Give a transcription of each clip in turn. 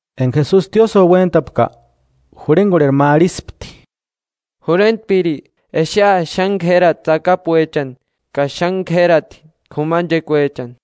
Enga Jesusi tiósïo uéntapka, jurhengorheri ma arhispti: –¡Jurhentpiri, exea xáni k'érati tsakapuechani ka xáni k'érati k'umanchekuechani!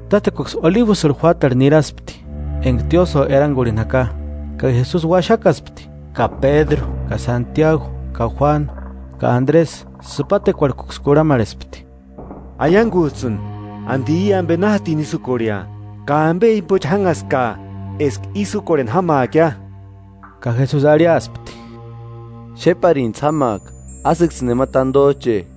Tátsekuaksï Olibusï juátarhu niraspti, enga tiósïo erangurhini jaka. Ka Jesusi uaxakaspti, ka Pédru ka Santiagu ka Juánu ka Andresï sïpatekuarhkuksï kurhamarhespti: 4–Aiangujtsïni. ¿Andi i ambe na jatini ísï úkorhea? Ka ¿Ambe jimbochi jánhaskaa eska ísï úkorheni jámaakia? Ka Jesusi arhiaspti: “Xéparinijtsï jámaaka ásïksïni nema tandojche.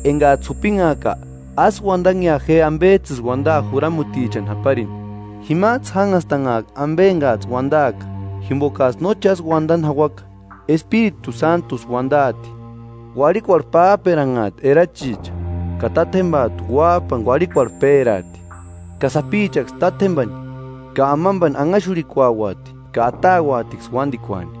Engajtsï jupinhaaka, ásï uandanhea je ambejtsïsï uandaa juramutichani japarini. Jimajtsï jánhastanhaaka ambe engajtsï uandaaka, jimbokajtsï no chásï uandani jauaka, Espiritu Sántusï uandaati. Uarhikuarhu pájperanhaati erachicha ka tátjembajtu uájpani uarhikuarhu péraati; ka sapichaksï tátjembani ka amambani anhaxurhikuauati ka atauatiksï uándikuani.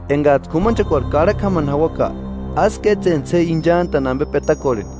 engajtsï k'umanchekuarhu karhakua jámani jauaka, ásï kétsentsï je inchantani ambe petakorheni;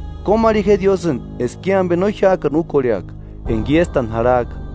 Kómarhi je Diósïni eska i ambe no jiájkani úkorheaka enga iéstani jarhajka,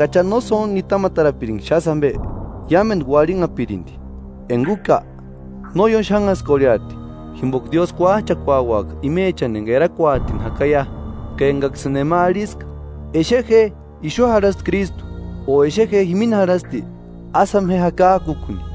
Enga Acha no sóntku nitamatarapiringa xásï ambe, iámendu uarhinhapirindi; enga úka, no ióni xanhaskorheati jimboka Diósï kuájchakuauaka imechani enga erakuatini jakaia.” “Ka engaksïni nema arhiska: ‘Exe je, ixu jarhasti Krístu’ o ‘Exe je, jimini jarhasti’, ásï jáma je jakajkukuni.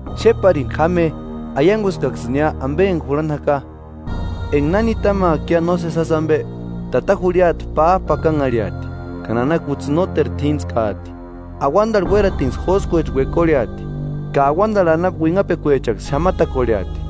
¡Xéparini jáma je! Aianguskaksïnia ambe enga jurhani jaka.” “Enga na nitamaakia nósesi jásï ambe, tata jurhiata pájpapakanharhiati, ka nana kutsï nóteru t'íntskaati, auandarhu uératinksï jóskuecha uekorheati, ka auandarhu anapu uinhapekuechaksï xamatakorheati.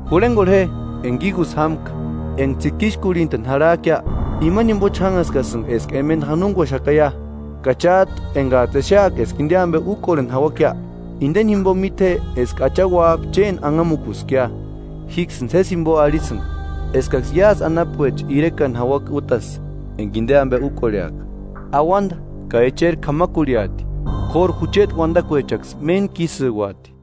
“Jurhengorhe je enga igusï jámka: Enga tsikixkurhintani jarhajkia, imani jimbochi jánhaskasïnga eska emenda janonguaxakaia. Ka chájtu engajtsï exeaka eska inde ambe úkorheni jauakia, indeni jimbo míte je eska Acha Uájpa chéni anhamukuskia. Jíksïni sési jimbo arhisïnga, eskaksï iásï anapuecha irekani jauaka útasï, enga inde ambe úkorheaka. Auanda ka echeri k'ámakurhiati, k'óru jucheti uandakuechaksï méntkisïuati.”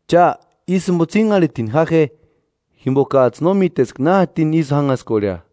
“Cha, ísï jimbo tsínharhitini ja je, jimbokajtsï no míteska na jatini ísï jánhaskorhea.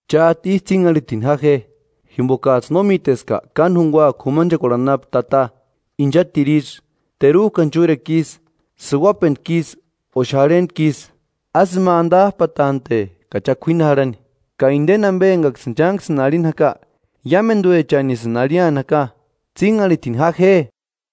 Chájtu ísï tsínharhitini ja je, jimbokajtsï no míteska káni jungua k'umanchekuarhu anapu tata, inchatiru isï, terujkani chúrekua isï, sïuajpentku isï o xárhentku isï; ásï ima andajpatante ka cha k'uíni jarhani. Ka indeni ambe engaksïni chánksïni arhini jaka, iámenduechanisïni arhiani jaka: ¡Tsínharhitini ja je!”